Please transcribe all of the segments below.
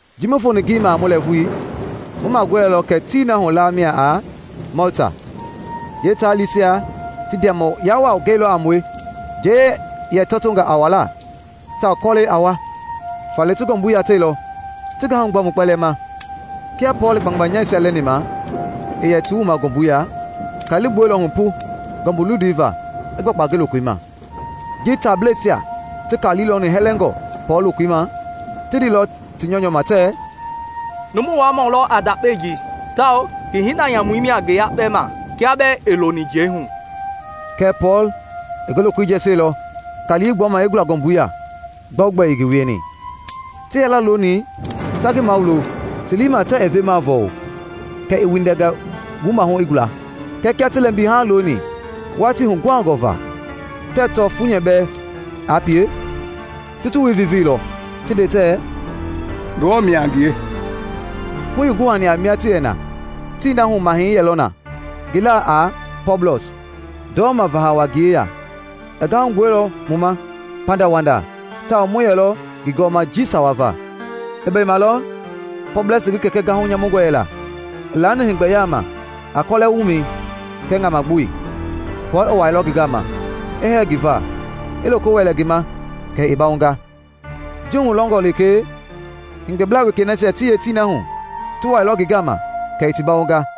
Ji mu foni ngeyeima a mu lɛɛvui, mu magɔɛilɔ kɛ tii na hu laa mia a Mɔlta. Yeetaalisia ti ndiamɔya waa gɛilɔ a mue. Njei yɛ tɔtonga a wuala tawao kɔlɛi a wa, faale ti ngɔmbui yateilɔ ti gahu gbua mu kpɛlɛɛ ma. Kia Pɔɔl i kpangbanyaasia lɛni ma i yɛ ti wuma ngɔmbui ya, kali i gbuɛilɔ hu pu ngɔmbu luindui va i gbakpa ngi lokoi ma. Ji taableisia ti kali lɔni hɛlɛngɔ Pɔɔl lokoi ma, ti ndeilɔ ti nyɔunyɔu ma tɛ, “Numu waamɔ lɔ a ndakpao ji, tawao ngi hinda nyamui mia ngi yakpɛ ma kia bɛɛ ii loni njei hu.” Kɛɛ Pɔɔl i ngi lokoi jɛsielɔ kali i gbuama i gula ngɔmbui ya gbɛogbɛ ii ngi wieni. Ti yɛlɔ looni ta ngi mawulo ti lii i ma tɛɛ i vemaa vɔɔlu kɛ i windɛnga wumahu i gula. Kɛɛ kia ti lɛmbi haaŋ looni watii huguhangɔ va tɛɛ tɔ funyɛ bɛɛ aa pie, ti ti wui vivii lɔ ti nde tɛ, “Ngewɔ mia a ngie!” Hu ii guhani a mia ti yɛ na, tii na hu mahɛi yɛlɔ na ngi laa a Pɔblɔs, ndɔma vahawa ngi yeya. I gahu gbuɛilɔ mu ma pandawanda tawao mu yɛlɔ ngi gɔɔma jii sawa va. I bɛi malɔ Pɔblɔsi ngi kɛkɛ gahu nyamungɔ yɛla i laani heegbɛ yalema a kɔlɛ wumɛi kɛɛ ŋamagboi. Pɔɔl i wuailɔ ngi gama, i hɛɛ ngi va, i loko wɛlɛ ngi ma kɛ i bawonga. Ji hulɔngɔ lekee, heegbɛblaa wekei nasia ti yee tii na hu ti wailɔ ngi gama kɛ i ti bawonga.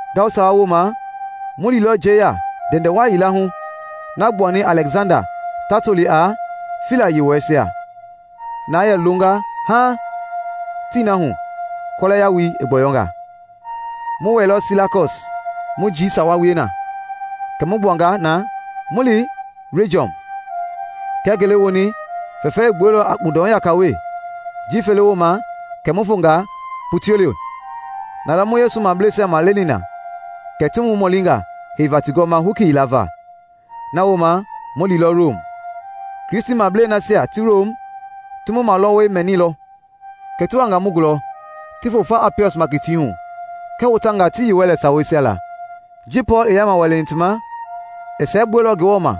Ngawu sawa woma mu liilɔ njeiya ndɛndɛwa yila hu na gbuani Alɛksanda ta toli a “Fila Yewɔɛisia,” na yɛ longa haaŋ tii na hu kɔlɛ yawui i gbɔyɔnga. Mu wɛilɔ Silakɔs mu jii sawa wie na. Kɛ mu gbuanga na mu li Rejiɔm. Kia ngele woni fɛfɛi i gbuɛilɔ a kpundɔhu yaka we, jii fele woma kɛ mu fonga Putioli. Nalɔ mu Yesu mableisia maleni na kɛ ti mu mɔlinga heiva ti gɔɔma hoki yila va. Nawooma mu liilɔ Rom. Kristimablei nasia ti Rom ti mu malɔwɔi mɛnilɔ, kɛ ti wanga mu gulɔ ti fo fa Apiɔs Makitiihu kɛɛ Hotangaa ti yii Wɛlɛ Saweisia la. Ji Pɔɔl i yaama wɛlɛni ti ma, i siɛgbuɛilɔ Ngewɔ ma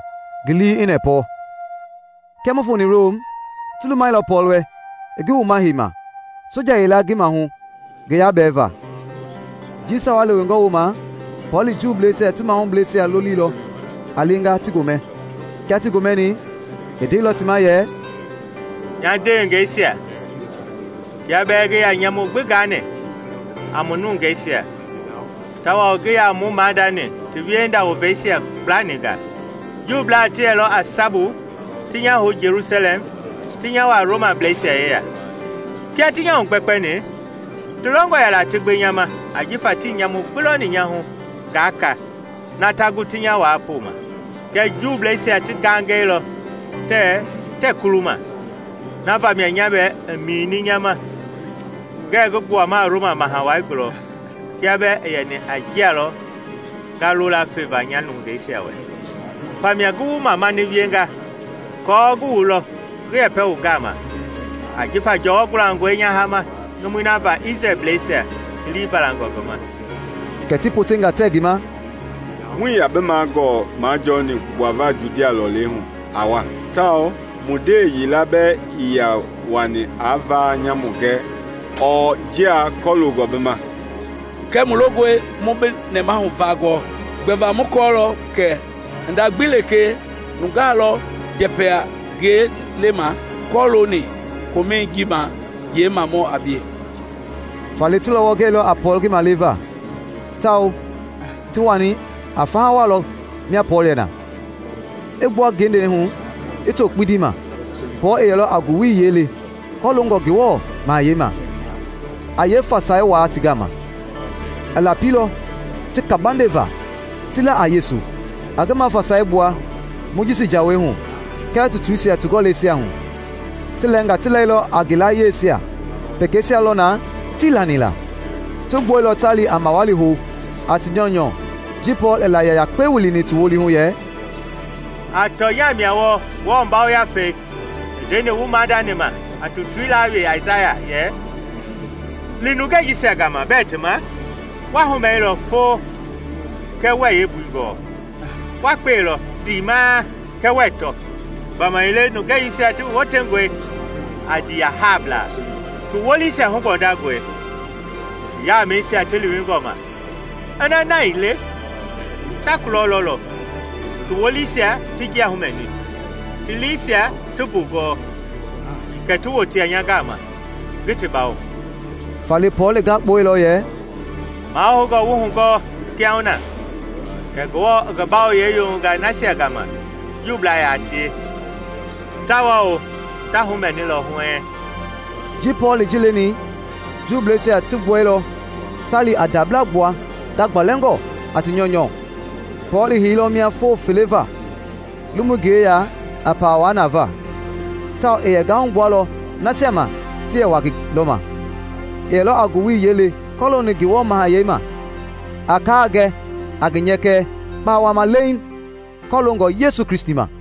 ngi lii i nɛpɔ. Kia mu foni Rom, ti lumailɔ Pɔɔl wɛ i ngi wuma heima soja yila ngi maahu ngi yabɛɛva. Jii sawa lewengɔ woma Pɔɔl i Juuisia ti mahubleisia lolilɔ a lenga ti gomɛ. Kia ti gomɛni, i ndeilɔ ti ma yɛ, “Nya ndewengeisia, kia bɛɛ ngii yaa nyamu gbii gani a mu nungeisia tawao ngii yaa mu maadani ti wiehinda woveisia gblaninga, Juublaa ti yɛlɔ a sabu ti nya hou Jelusalɛm ti nya wuaa Romableisia yeya. Kia ti nya hugbɛkpɛni ti longɔ yɛla ti gbe nya ma, ajifa tii nyamu gbi lɔni nya hu ngaa ka na ta gu ti nya waa poma. Kɛɛ Juubleisia ti gangɛilɔ tɛ tɛɛ kuluma, na va mia nya bɛɛ i mini nya ma ngɛ ngi gbuama Roma Maha Wai gulɔ kia bɛɛ ii yɛni a njia lɔ nga lola feva nya nungeisia wɛ. Famia ngi wu mamani wienga aako ngi wu lɔ ngi yɛpɛ wu gama; ajifa jɔwɔ gulangɔi nya hama numui na va Isrɛlbleisia ti lii valangɔ ngi ma.” Kɛ ti potenga tɛ ngi ma, “Muii yaa bi magɔlɔ majɔɔni aa gbua Judia lɔlei hu aa wa, tawao mu ndewe yila bɛɛ ii yaa wani a vaa nyamu gɛ ɔɔ njia kɔloongɔ bi ma. Kɛɛ mu longɔe mu bi nɛmahu vaa gɔɔ; gbɛva mu kɔɔlɔ kɛ hinda gbi lekee nungaa lɔ njɛpɛ-a-ngie lema kɔlooni komɛi ji ma yeemamɔ a bie.” Faale ti lɔwɔ gɛilɔ a Pɔɔl ngi maleva, tawao ti wani a faha waa lɔ mia Pɔɔl yɛ na. I gbua ngende hu i too kpindi ma, Pɔɔl i yɛlɔ a ngowili yiɛi le kɔloongɔ Ngewɔ Mahayɛi ma, a yeefasai wuaa ti gama. I lapilɔ ti kabande va ti la a Yesu, a ngi mafasai gbua Mojisi Jawei hu kɛɛ tutuisia ti gɔlɛisia hu. Ti lɛnga ti lailɔ a ngi layiesia, pekeisia lɔ na tii lani la. Ti gbuɛilɔ ta li a mawali hou a ti nyɔunyɔ ji Pɔɔl i layia yakpe wilini ti wolihu yɛ, “A tɔnya mia wɔɔ Ngewɔ Yafei i ndeni wu maadani ma a tutui laa we Aisaya yɛ: ‘Li nungei jisia gama bɛɛ ti ma, wa humɛilɔ fo kɛɛ wuɛɛ yeembui gɔɔ; wa kpe lɔ ndimaa kɛɛ wuɛɛ tɔ. Gbamaile nungei jisia ti wotengɔe a ndiiyahablaa, ti wolisia hugbɔndangɔi, ti yamɛisia ti liiwingɔ ma. Kiaa na ii le, ta kulɔ lɔlɔ, ti wolisia ti njia humɛni, ti liisia ti mbugɔɔ, kɛɛ ti wotea nya gama, ngi ti bawo.’” Faale Pɔɔl i gakpueilɔ yɛ, “Mahoungɔ wu hugɔɔ kiahuna kɛ Ngewɔ i ngi bawoyɛi yoyonga nasia gama Juubla yaa tie, tawao ta humɛni lɔ huɛɛŋ!” [ Ji Pɔɔl i ji leni, Juusia ti gbuɛilɔ ta li a ndabla gbua gagbalɛngɔ a ti nyɔunyɔu.] Pɔɔl i heilɔ mia foo fele va, lomui ngi yeya a pawa wuaa na va. Tawao i yɛ gahu gbualɔ nasia ma ti yɛ wa ngi lɔma. I yɛlɔ a ngowili yiɛi le kɔlooni Ngewɔ mahayɛi ma, a kaa gɛ a ngi nyɛkɛ kpawama leeŋ kɔloongɔ Yesu Kristi ma.